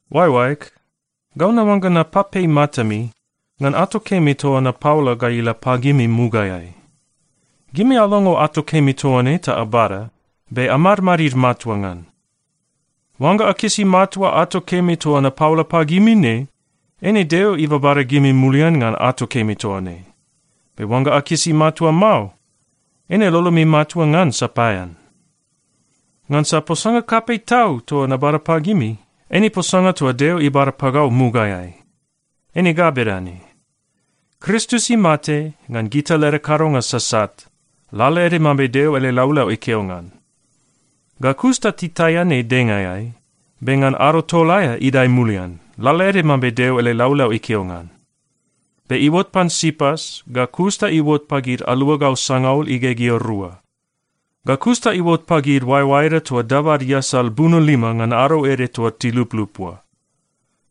Oaeoaeg, gau naoangga napapei matami ngan ato kemi toa napaola ga ila pagimi mugaeai. Gimi alongo ato kemi toa ne ta abada, be amadmadid matua ngan. Oangga akisi matua ato kemi toa napaola pagimi ne, eine Deo ibabada gimi mulian ngan ato kemi toa ne. Be oangga akisi matua mao, eine lolomi matua ngan sapaean. Ngansa posanga kapei tau toa nabada pagimi, eine posanga toa Deo ibada pagau mugaeai. Eine ga bedane: Kristus imate ngan gita leda kadonga sasat, lalaede mambe Deo ele laulau ikeo ngan. Ga kus ta titaian ei dengaeai, be ngan ado tol aea idae mulian, lalaede mambe Deo ele laulau ikeo ngan. Be iuot pan Sipas ga kus ta iuot pagid aluagau sangaul igegea rua. Ga kus ta iuot pagid oaeoaeda toa dabad iasal buno lima ngan ado ede toa tiluplup oa.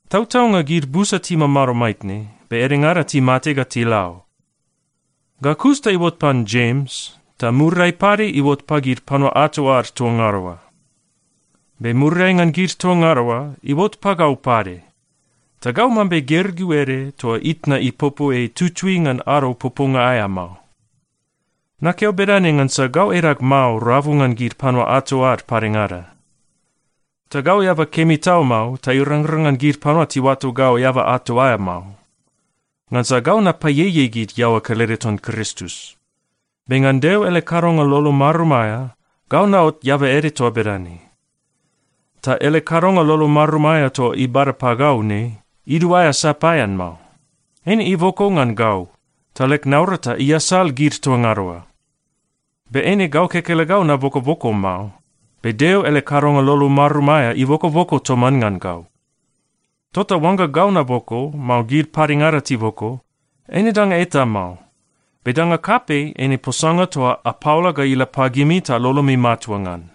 Tautaunga gid busa timamado maitne, be edengada timate ga tila o. Ga kus ta iuot pan Jems, ta muriai pade iuot pagid panua ato ad toa ngada oa. Be muriai ngan gid toa ngada oa, iuot pagau pade. Ta gau mambe gergeu ede toa itna ipopo ei tutui ngan ado poponga aea mao. Nakeo bedane ngansa gau edag mao rabu ngan gid panua ato ad padengada. Ta gau eaba kemi tau mao ta irangrang ngan gid panua tiuato gau eaba ato aea mao, ngansa gau napaieiei gid iaoa kelede ton Kristus. Be ngan Deo ele kadonga lolo marum aea, gau naot eaba ede toa bedane. Ta ele kadonga lolo marum aea toa ibada pagau ne, iduaea sapaean mao. Eine iboko ngan gau, ta leg naurata iasal gid toa ngada oa. Be eine gau kekelegau nabokoboko mao, be Deo ele kadonga lolo marum aea ibokoboko toman ngan gau. Tota oangga gau naboko, mao gid padengada tiboko, eine danga eta mao. Be danga kapei eine posanga toa apaola ga ila pagimi ta lolomi matua ngan.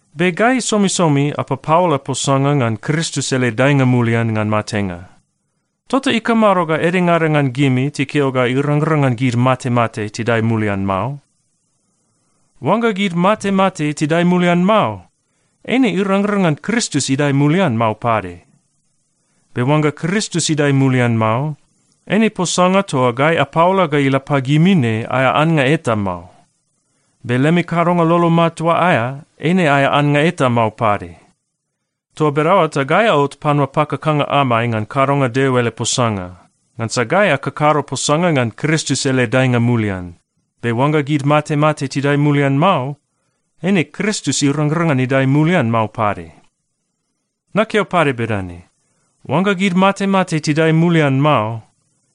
Be gai somisomi apapaola posanga ngan Kristus ele daenga mulian ngan matenga, tota ikamado ga edengada ngan gimi tikeo ga irangrang ngan gid matemate tidae mulian mao? Oangga gid matemate tidae mulian mao, eine irangrang ngan Kristus idae mulian mao pade. Be oangga Kristus idae mulian mao, eine posanga toa gai apaola ga ila pagimi ne aea annga eta mao. Be lemi kadonga lolo matua aea, eine aea annga eta mao pade. Toa bedaoa ta gai aot panua pakakanga amai ngan kadonga Deo ele posanga, ngansa gai akakado posanga ngan Kristus ele daenga mulian. Be oangga gid matemate tidae mulian mao, eine Kristus irangrang ngan idae mulian mao pade. Nakeo pade bedane: Oangga gid matemate tidae mulian mao,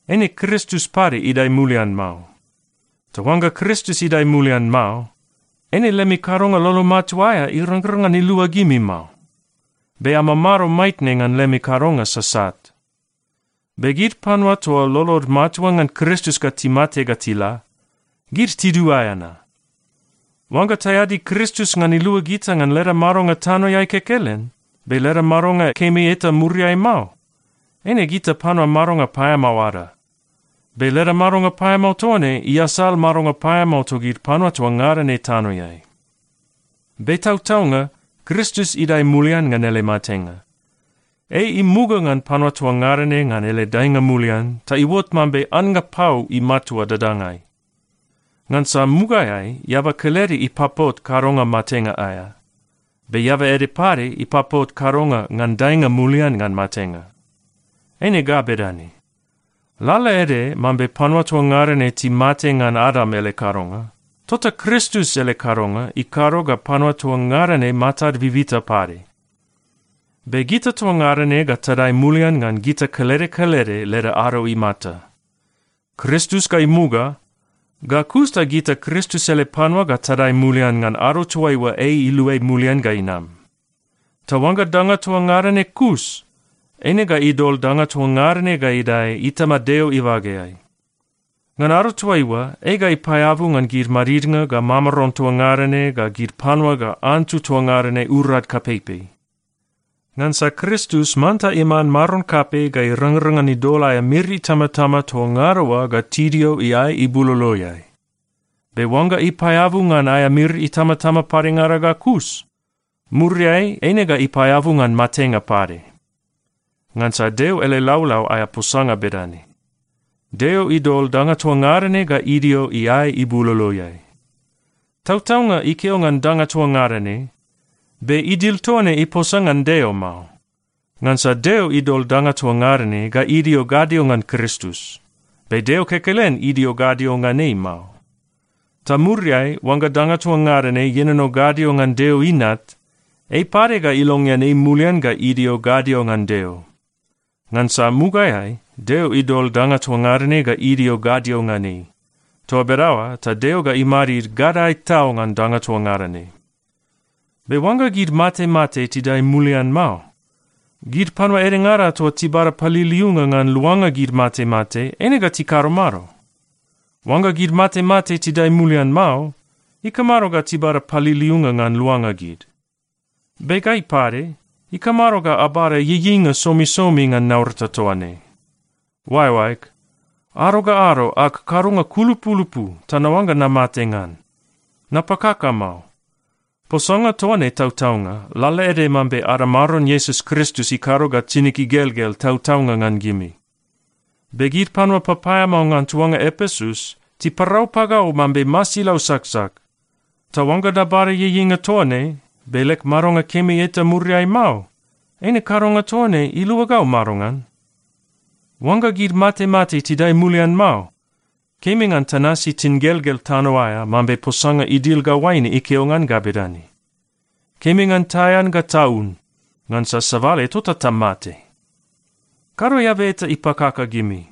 eine Kristus pade idae mulian mao. Ta oangga Kristus idae mulian mao, eine lemi kadonga lolo matua aea irangrang ngan ilua gimi mao. Be amamado maitne ngan lemi kadonga sasat. Be gid panua toa lolod matua ngan Kristus ga timate ga tila, gid tiduaea na. Oangga taeadi Kristus ngan ilua gita ngan leda madonga tanoeai kekelen, be leda madonga kemi eta muriai mao, eine gita panua madonga paeamao ada. Be leda madonga paeamao toa ne iasal madonga paeamao togid panua toa ngada ne tanoeai. Be tautaunga, Kristus idae mulian ngan ele matenga. Ei imuga ngan panua toa ngada ne ngan ele daenga mulian ta iuot mambe annga pau imatua dadangai. Ngansa mugaeai eaba kelede ipapot kadonga matenga aea. Be eaba ede pade ipapot kadonga ngan daenga mulian ngan matenga. Eine ga bedane: Lalaede mambe panua toa ngada ne timate ngan Adam ele kadonga, tota Kristus ele kadonga ikado ga panua toa ngada ne matad bibita pade. Be gita toa ngada ne ga tadae mulian ngan gita kelede kelede leda ado imata. Kristus ga imuga, ga kus ta gita Kristus ele panua ga tadae mulian ngan ado toaiua ei iluai mulian ga inam. Ta oangga danga toa ngada ne kus, eine ga idol danga toa ngada ne ga idae Itama Deo ibageai. Ngan ado toaiua, ei ga ipaeabu ngan gid madidnga ga mamaron toa ngada ne ga gid panua ga antu toa ngada ne urad kapeipei. Ngansa Kristus manta iman Maron kapei ga irangrang ngan idol aea miri itamatama toa ngada oa ga tidio iae ibuloloeai. Be oangga ipaeabu ngan aea miri itamatama padengada ga kus, muriai eine ga ipaeabu ngan matenga pade. Ngansa Deo ele laulau aea posanga bedane, “Deo idol danga toa ngada ne ga idio iae ibuloloeai.” Tautaunga ikeo ngan “danga toa ngada ne,” be idil toa ne iposa ngan Deo mao. Ngansa Deo idol danga toa ngada ne ga idio gadio ngan Kristus, be Deo kekelen idio gadio ngan ei mao. Ta muriai oangga danga toa ngada ne ienono gadio ngan Deo Inat, ei pade ga ilongean ei mulian ga idio gadio ngan Deo, ngansa mugaeai Deo idol danga toa ngada ne ga idio gadio ngan ei. Toa bedaoa ta Deo ga imadid gadae tau ngan danga toa ngada ne. Be oangga gid matemate tidae mulian mao, gid panua edengada toa tibada paliliunga ngan luanga gid matemate, eine ga tikado mado? Oangga gid matemate tidae mulian mao, ikamado ga tibada paliliunga ngan luanga gid? Be gai pade, ikamado ga abada ieieinga somisomi ngan naurata toa ne? Oaeoaeg, ado ga ado ag kadonga kulupulupu ta naoangga namate ngan. Napakaka mao. Posanga toa ne tautaunga, lalaede mambe ada Maron Iesus Kristus ikado ga tinig igelgel tautaunga ngan gimi. Be gid panua papaeamao ngan tuanga Epesus tiparau pagau mambe masilau saksak. Ta oangga nabada ieieinga toa ne, be leg madonga kemi eta muriai mao, eine kadonga toa ne ilua gau madongan? Oangga gid matemate tidae mulian mao, kemi ngan tanasi tingelgel tano aea mambe posanga idil ga oaine ikeo ngan ga bedane, “Kemi ngan taean ga taun, ngansa sabale tota tamate.” Kado eaba eta ipakaka gimi.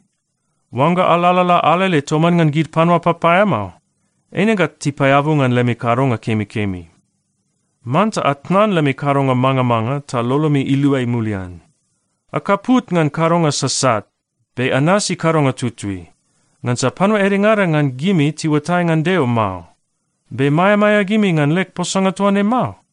Oangga alalala alele toman ngan gid panua papaeamao, eine ga tipaeabu ngan lemi kadonga kemikemi. Manta atnan lemi kadonga mangamanga ta lolomi iluai mulian. Akaput ngan kadonga sasat be anasi kadonga tutui. Ngansa panua edengada ngan gimi tiuatai ngan Deo mao. Be maeamaea gimi ngan leg posanga toa ne mao?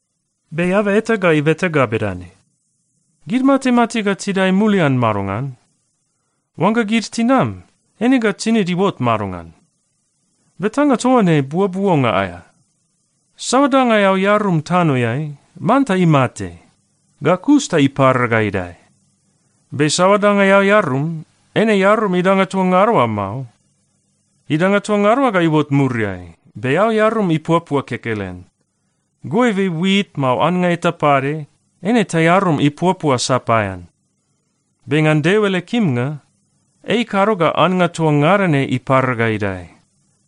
Be eaba eta ga ibeta ga bedane, “Gid matemate ga tidae mulian madongan? Oangga gid tinam, eine ga tinid iuot madongan?” Betanga toa ne buobuonga aea. Saoa danga eao earum tanoeai, manta imate. Ga kus ta ipara ga idae. Be saoa danga eao earum, eine earum idanga toa ngada oa mao. Idanga toa ngada oa ga iuot muriai. Be eao earum ipuapua kekelen. Goibe wit, mao annga eta pade, eine taearum ipuapua sapaean. Be ngan Deo ele kimnga, ei ikado ga annga toa ngada ne ipara ga idae,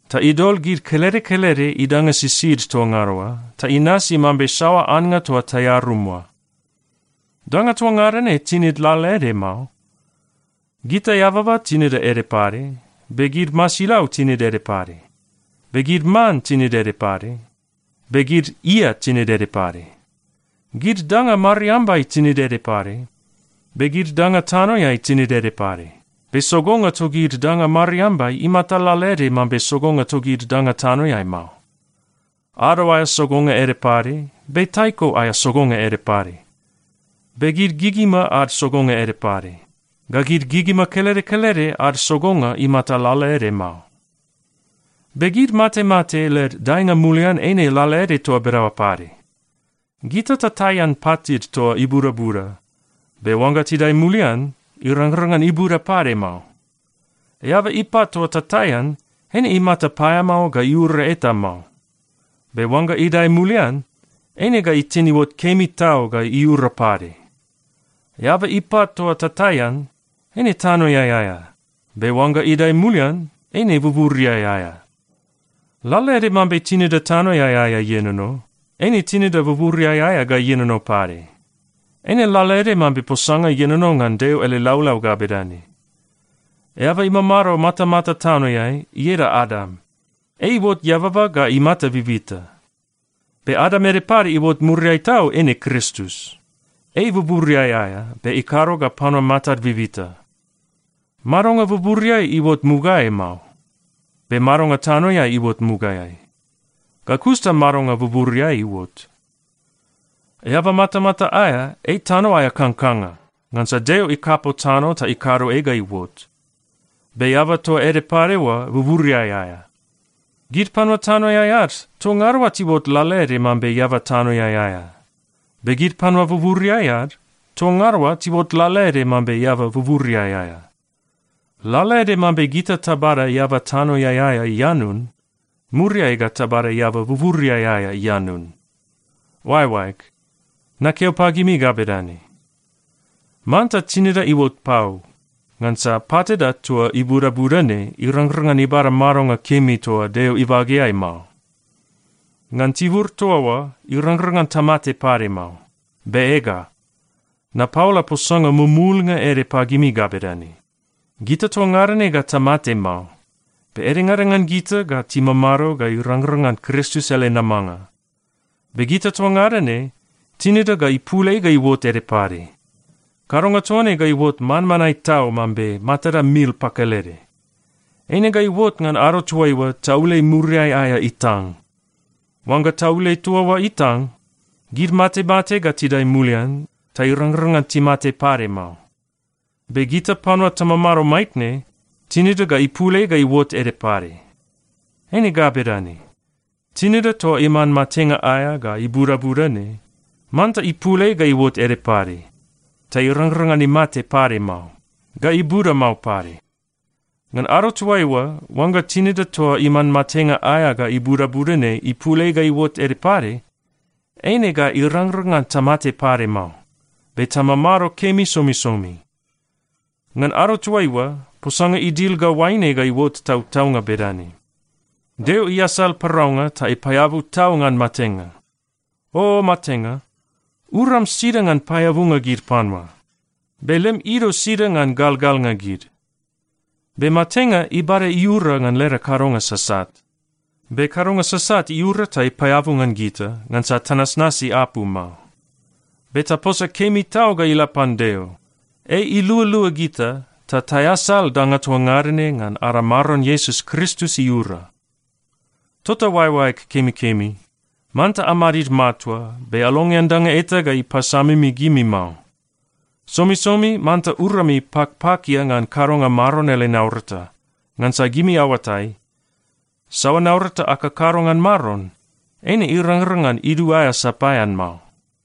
ta idol gid kelede kelede idanga sisid toa ngada oa, ta inasi mambe saoa annga toa taearum oa. Danga toa ngada ne tinid lalaede mao. Gita eababa tinida ede pade, be gid masilau tinid ede pade, be gid man tinid ede pade, be gid ia tinid ede pade. Gid danga mariambai tinid ede pade. Be gid danga tanoeai tinid ede pade. Be sogonga togid danga mariambai imata lalaede mambe sogonga togid danga tanoeai mao. Ado aea sogonga ede pade, be taiko aea sogonga ede pade. Be gid gigima ad sogonga ede pade. Ga gid gigima kelede kelede ad sogonga imata lalaede mao. Be gid matemate led daenga mulian eine lalaede toa bedaoa pade. Gita tataian patid toa ibudabuda. Be oangga tidae mulian, irangrang ngan ibuda pade mao. Eaba ipat toa tataian, eine imata paeamao ga iura eta mao, be oangga idae mulian, eine ga itin iuot kemi tau ga iura pade. Eaba ipat toa tataian, eine tanoeai aea. Be oangga idae mulian, eine buburiai aea. Lalaede mambe tinida tanoeai aea ienono, eine tinida buburiai aea ga ienono pade. Eine lalaede mambe posanga ienono ngan Deo ele laulau ga bedane, “Eaba imamado matamata tanoeai, ieda Adam. Ei iuot eababa ga imata bibita.” Be Adam ede pade iuot muriai tau eine Kristus. Ei buburiai aea be ikado ga panua matad bibita. Madonga buburiai iuot mugaeai mao. Be madonga tanoeai iuot mugaeai, ga kus ta madonga buburiai iuot. Eaba matamata aea, ei tano aea kangkanga, ngansa Deo ikapo tano ta ikado ei ga iuot. Be eaba toa ede pade oa buburiai aea. Gid panua tanoeai ad, toa ngada oa tiuot lalaede mambe eaba tanoeai aea. Be gid panua buburiai ad, toa ngada oa tiuot lalaede mambe eaba buburiai aea. Lalaede mambe gita tabada eaba tanoeai aea ianun, muriai ga tabada eaba buburiai aea ianun. Oaeoaeg, nakeo pagimi ga bedane: Manta tinida iuot pau, ngansa patida toa ibudabuda ne irangrang ngan ibada madonga kemi toa Deo ibageai mao. Ngan tibur toa oa, irangrang ngan tamate pade mao. Be ega, napaola posanga mumulnga ede pagimi ga bedane: Gita toa ngada ne ga tamate mao, be edengada ngan gita ga timamado ga irangrang ngan Kristus ele namanga. Be gita toa ngada ne, tinida ga ipul ei ga iuot ede pade. Kadonga toa ne ga iuot manmanae tau mambe matada mil pakelede. Eine ga iuot ngan ado toaiua taule muriai aea itang. Oangga taule toa oa itang, gid matemate ga tidae mulian ta irangrang ngan timate pade mao. Be gita panua tamamado maitne, tinida ga ipul ei ga iuot ede pade. Eine ga bedane: Tinida toa iman matenga aea ga ibudabuda ne, manta ipul ei ga iuot ede pade, ta irangrang ngan imate pade mao, ga ibuda mao pade. Ngan ado toaiua, oangga tinida toa iman matenga aea ga ibudabuda ne ipul ei ga iuot ede pade, eine ga irangrang ngan tamate pade mao, be tamamado kemi somisomi. Ngan ado toaiua, posanga idil ga oaine ga iuot tautaunga bedane, “Deo iasal paraunga ta ipaeabu tau ngan matenga.” “O matenga, uram sida ngan paeabunga gid panua? Be lem ido sida ngan galgalnga gid?” Be matenga ibada iura ngan leda kadonga sasat. Be kadonga sasat iura ta ipaeabu ngan gita, ngansa tanasnasi apu mao. Be taposa kemi tau ga ila pan Deo! Ei ilualua gita ta taeasal danga toa ngada ne ngan ada Maron Iesus Kristus iura. Tota oaeoaeg kemikemi, manta amadid matua, be alongean danga eta ga ipasamimi gimi mao. Somisomi manta urami pakpakia ngan kadonga Maron ele naurata. Ngansa gimi aoatai, saoa naurata akakado ngan Maron, eine irangrang ngan iduaea sapaean mao.